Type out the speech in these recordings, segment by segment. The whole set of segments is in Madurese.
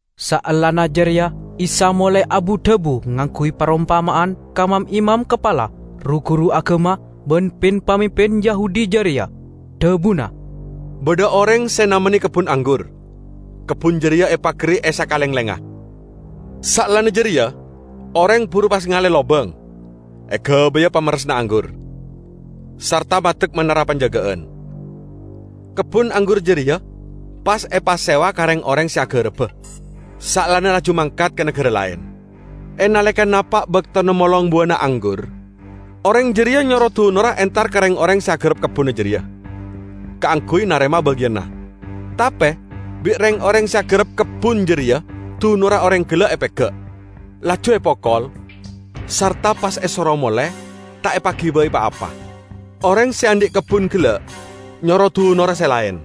Saellana jareya Isa molae abu-dhabu ngangguy parompama'an ka mam-imam kapala, ru-guru agama ban pin-pamimpin Yahudi jareya. Dhabuna: "Badha oreng se namenne kebbun anggur, kebbun jareya epagari e sakalenglengnga. Saellana jareya oreng buru pas ngale lobang egabaya pamerressanna anggur, sarta maddek manara panjaga'an. Kebbun anggur jareya pas epasewa ka reng-oreng se agaraba, saellana laju mangkat ka nagara laen. E naleka napa' baktona molong buwana anggur, oreng jareya nyoro dunorra entar ka reng-oreng se agarap kebbunna jareya, kaangguy narema bagiyanna. Tape bi' reng-oreng se agarap kebbun jareya dunorra oreng gella' epega', laju epokol sarta pas esoro mole ta' epagibai pa-apa. Oreng se andhi' kebbun gella' nyoro dunorra se laen.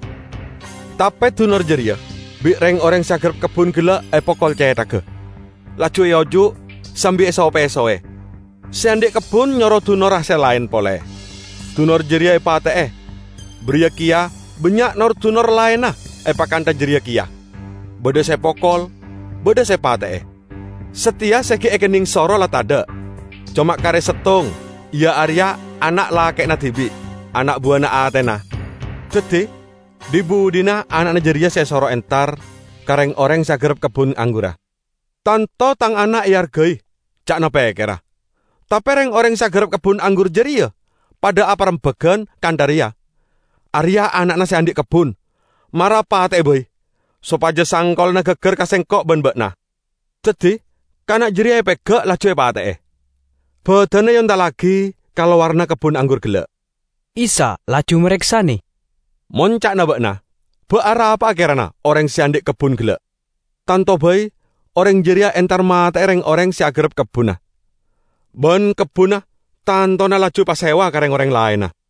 Tape dunor jareya bi' reng-oreng se agarap kebbun gella' epokol cethagga, laju eojuk sambi eso-pesowe. Se andhi' kebbun nyoro dunorra se laen pole, dunor jareya epate'e. Bariya keya bannya' nor-dunor laenna epakantha jareya keya, badha se epokol, badha se epate'e. Sateya se gi' ekenneng soro la tadha', coma kare settong, iya areya ana' lake'na dibi', ana' buwana atena. Daddi dhi-budhina ana'na jareya se esoro entar ka reng-oreng se agarap kebbun anggurra. 'Tanto tang ana' eargai,' ca'na pekkerra. Tape reng-oreng se agarap kebbun anggur jareya padha aparembagan kantha reya, 'Areya' ana'na se andhi' kebbun. Mara pate'e bai, sopaja sangkolanna gaggar ka sengko' ban ba'na!' Daddi kana' jareya epega', laju epate'e. Badanna eontallagi ka lowaranna kebbun anggur gella'." Isa laju mareksane, "Mon ca'na ba'na ba' arapa'a kerana oreng se andhi' kebbun gella'? Tanto bai oreng jareya entar mate'e reng-oreng se agarap kebbunna, ban kebbunna tantona laju epasewa ka reng-oreng laenna.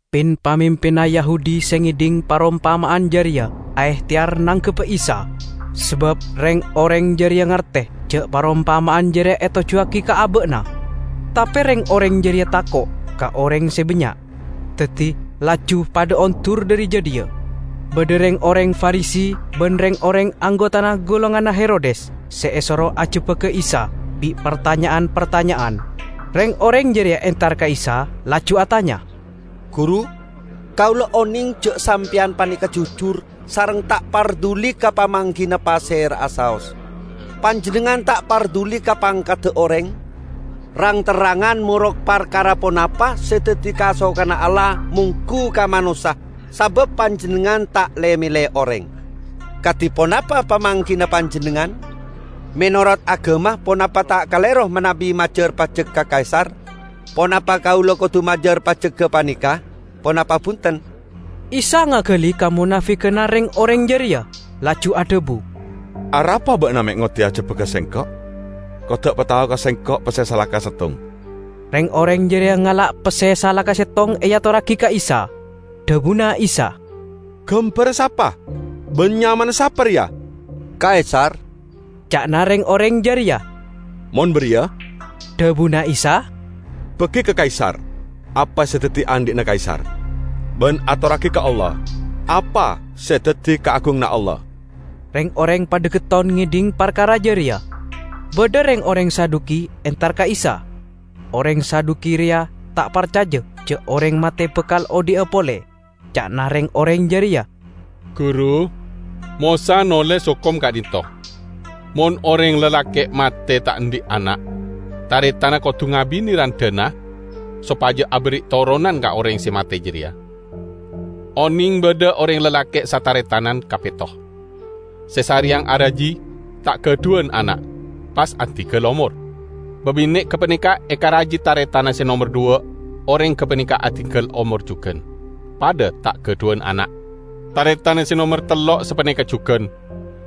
Pin-pamimpinna Yahudi se ngedhing parompama'an jareya aehteyar nangkebba Isa, sabab reng-oreng jareya ngarte ja' parompama'an jareya etojjuwagi ka aba'na. Tape reng-oreng jareya tako' ka oreng se bannya', daddi laju padha ondur dhari jadhiya. Badha reng-oreng Farisi ban reng-oreng anggotana golonganna Herodes se esoro ajebbak Isa bi' partanya'an-partanya'an. Reng-oreng jareya entar ka Isa laju atanya, "Guru, kaula oneng ja' Sampeyan paneka jujur sareng ta' parduli ka pamanggina pasera'a saos. Panjennengngan ta' parduli ka pangkadda oreng, rang-terrangan morok parkara ponapa se daddi kasokanna Allah monggu ka manossa sabab Panjennengngan ta' le-mele oreng. Kadi ponapa pamanggina Panjennengngan, 'Menorot agama ponapa ta' kalero manabi majar pajek ka Kaisar? Ponapa kaula kodu majar pajek gapaneka, ponapa bunten?' " Isa ngagali kamonafiganna reng-oreng jareya, laju adhabu, "Arapa ba'na me' ngoddi ajebbaga Sengko'? Kodda' patao ka Sengko' pesse salaka settong." Reng-oreng jareya ngala' pesse salaka settong eatorragi ka Isa. Dhabuna Isa, "Gambarra sapa ban nyamana sapa reya?" "Kaisar," ca'na reng-oreng jareya. "Mon bariya," dhabuna Isa, "bagi ka Kaisar apa se daddi andhi'na Kaisar, ban atorragi ka Allah apa se daddi kaagunganna Allah." Reng-oreng padha getton ngedhing parkara jareya. Badha reng-oreng Saduki entar ka Isa. (Oreng Saduki reya ta' parcaja ja' oreng mate bakal odhi'a pole.) Ca'na reng-oreng jareya, "Guru, Mosa noles hokom ka'dhinto': 'Mon oreng lalake' mate, ta' andhi' ana', taretanna kodu ngabine randhana sopaja aberri' toronan ka oreng se mate jareya.' Oneng badha oreng lalake' sataretan kapetto. Se sareyang araji, ta' gadhuwan ana', pas adinggal omor. Babine' gapaneka ekaraji taretanna se nomer dhuwa' oreng gapaneka adinggal omor jugan, padha ta' gadhuwan ana'. Taretanna se nomer tello' sapaneka jugan,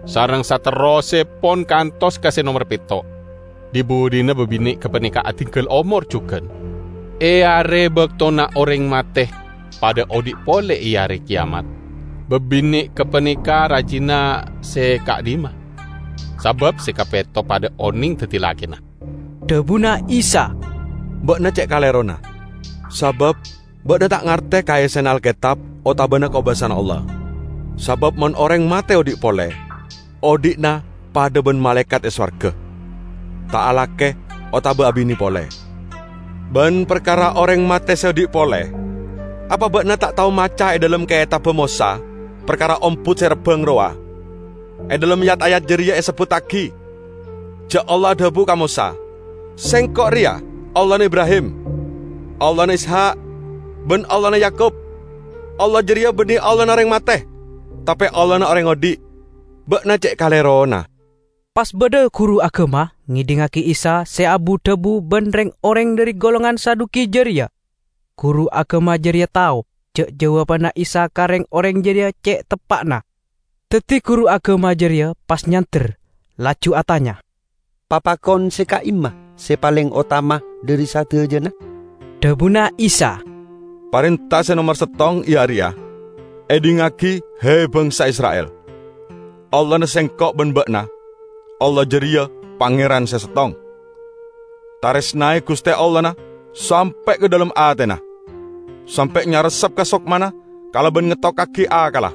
sareng saterrossepon kantos ka se nomer petto'. Dhi-budhina babine' gapaneka adinggal omor jugan. E are baktona oreng mate padha odhi' pole e are keyamat, babine' gapaneka rajina se ka'dhimma? Sabab se kapetto padha oneng daddi lakena." Dhabuna Isa, "Ba'na ce' kalerona. Sabab ba'na ta' ngarte ka essena Alketab otabana kobasana Allah. Sabab mon oreng mate odhi' pole, odhi'na padha ban malaekat e sowarga, ta' alake otaba abine pole. Ban parkara oreng mate se odhi' pole, apa ba'na ta' tao maca e dhalem Ketabba Mosa parkara ombut se rabbang rowa? E dhalem yat-ayat jareya esebbuttagi ja' Allah adhabu ka Mosa, 'Sengko' reya Allahna Ibrahim, Allahna Ishak ban Allahna Yakub.' Allah jareya banne Allahna oreng mate, tape Allahna oreng odhi'. Ba'na ce' kalerona!" Pas badha guru agama ngedhingngagi Isa se abu-dhabu ban reng-oreng dhari golongan Saduki jareya. Guru agama jareya tao ja' jawabanna Isa ka reng-oreng jareya ce' teppa'na. Daddi guru agama jareya pas nyander, laju atanya, "Papakon se ka'imma se paleng otama dhari sadajana?" Dhabuna Isa, "Parenta se nomer settong, iya areya: 'Edhingngagi, he, bangsa Isra'il! Allahna Sengko' ban ba'na, Allah jareya Pangeran Se Settong. Taresnae Guste Allahna sampe' ka dhalem atena, sampe' nyarepsep ka sokmana, kalaban ngettokkagi akkalla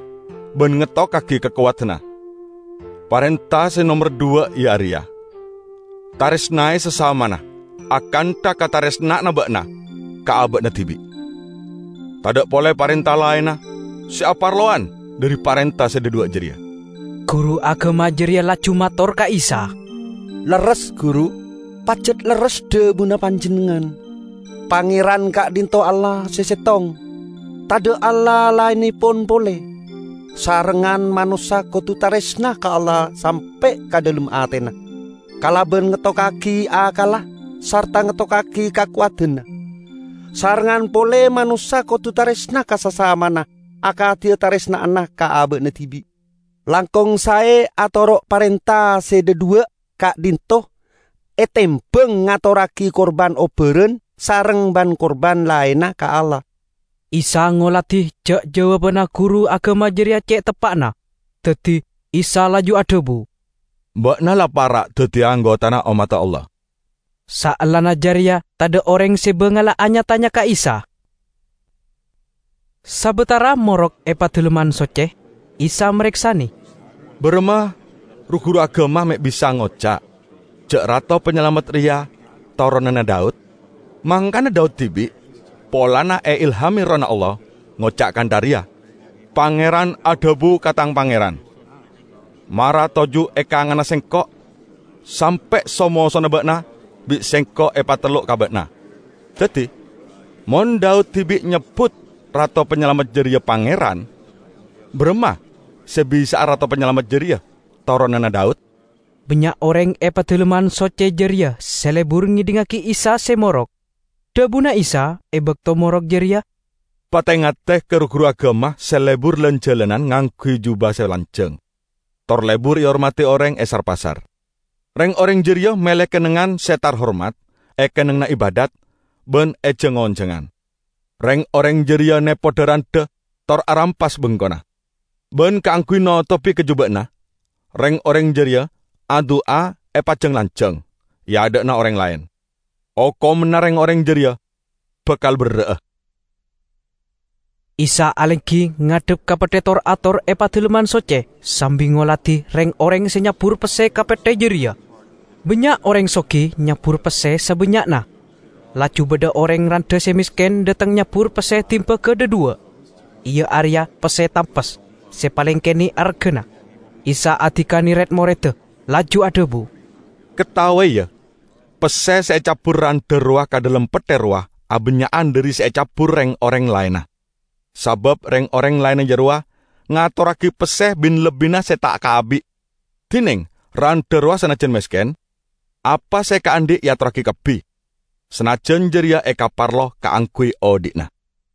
ban ngettokkagi kakowadanna.' Parenta se nomer dhuwa' iya areya: 'Taresnae sasamana, akantha kataresna'anna ba'na ka aba'na dibi'.' Tadha' pole parenta laenna se aparlowan dhari parenta se dhadhuwa' jareya." Guru agama jareya laju mator ka Isa, "Lerres, Guru! Pajat lerres dhabuna Panjennengngan: Pangeran ka'dhinto' Allah se settong, tadha' Allah laennepon pole. Sarengngan manossa kodu taresna ka Allah sampe' ka dhalem atena, kalaban ngettokkagi akkalla sarta ngettokkagi kakowadanna. Sarengngan pole manossa kodu taresna ka sasamana akadi kataresna'anna ka aba'na dibi'. Langkong sae atoro' parenta se dhadhuwa' ka'dhinto' etembang ngatorragi kurban obbaran sareng ban-kurban laenna ka Allah." Isa ngoladi ja' jawabanna guru agama jareya ce' teppa'na. Daddi Isa laju adhabu, "Ba'na la para' daddiya anggotana ommadda Allah." Saellana jareya tadha' oreng se bangala anya-tanya ka Isa. Sabatara morok e Padalemman Socce, Isa mareksane, "Baramma ru-guru agama me' bisa ngoca' ja' Rato Panyalamet reya toronanna Daud? Mangkana Daud dibi', polana eilhame Erroh Allah, ngoca' kantha reya, 'Pangeran adhabu ka tang Pangeran: Mara toju' e kanganna Sengko' sampe' so-mosona ba'na bi' sengko' epatellok ka ba'na.' Daddi mon Daud dibi' nyebbut Rato Panyalamet jareya 'Pangeran' baramma se bisa'a Rato Panyalamet jareya toronanna Daud?" Bannya' oreng e Padalemman Socce jareya se lebur ngedhingngagi Isa se morok. Dhabuna Isa e bakto morok jareya, "Pate-ngate ka ru-guru agama se lebur lan-jalanan ngangguy juba se lanjang tor lebur ehormadi oreng e sar-pasar. Reng-oreng jareya mele kennengngan se tarhormat e kennengnganna ibadhat ban e jang-onjangan. Reng-oreng jareya nepo dha-randha tor arampas bengkona. Ban kaangguy notobi kajuba'anna, reng-oreng jareya adu'a epajang-lanjang e adha'anna oreng laen. Okomanna reng-oreng jareya bakal berra'a!" Isa alenggi ngadhep ka petthe tor-ator e Padalemman Socce sambi ngoladi reng-oreng se nyabbur pesse ka petthe jareya. Bannya' oreng sogi nyabbur pesse sabannya'na; Laju badha oreng randha se mesken dhateng nyabbur pesse dimbaga dhadhuwa', iya areya pesse tampes se paleng kene' argana. Isa adikane red-moredda, laju adhabu, "Kataowe, ya: Pesse se ecabbur randha rowa ka dhalem petthe rowa abannya'an dhari se ecabbur reng-oreng laenna. Sabab reng-oreng laenna jarowa ngatorragi pesse bin-lebbinna se ta' kaabi'. Dineng randha rowa sanajjan mesken, apa se ekaandhi' eatorragi kabbi, sanajjan jareya ekaparlo kaangguy odhi'na."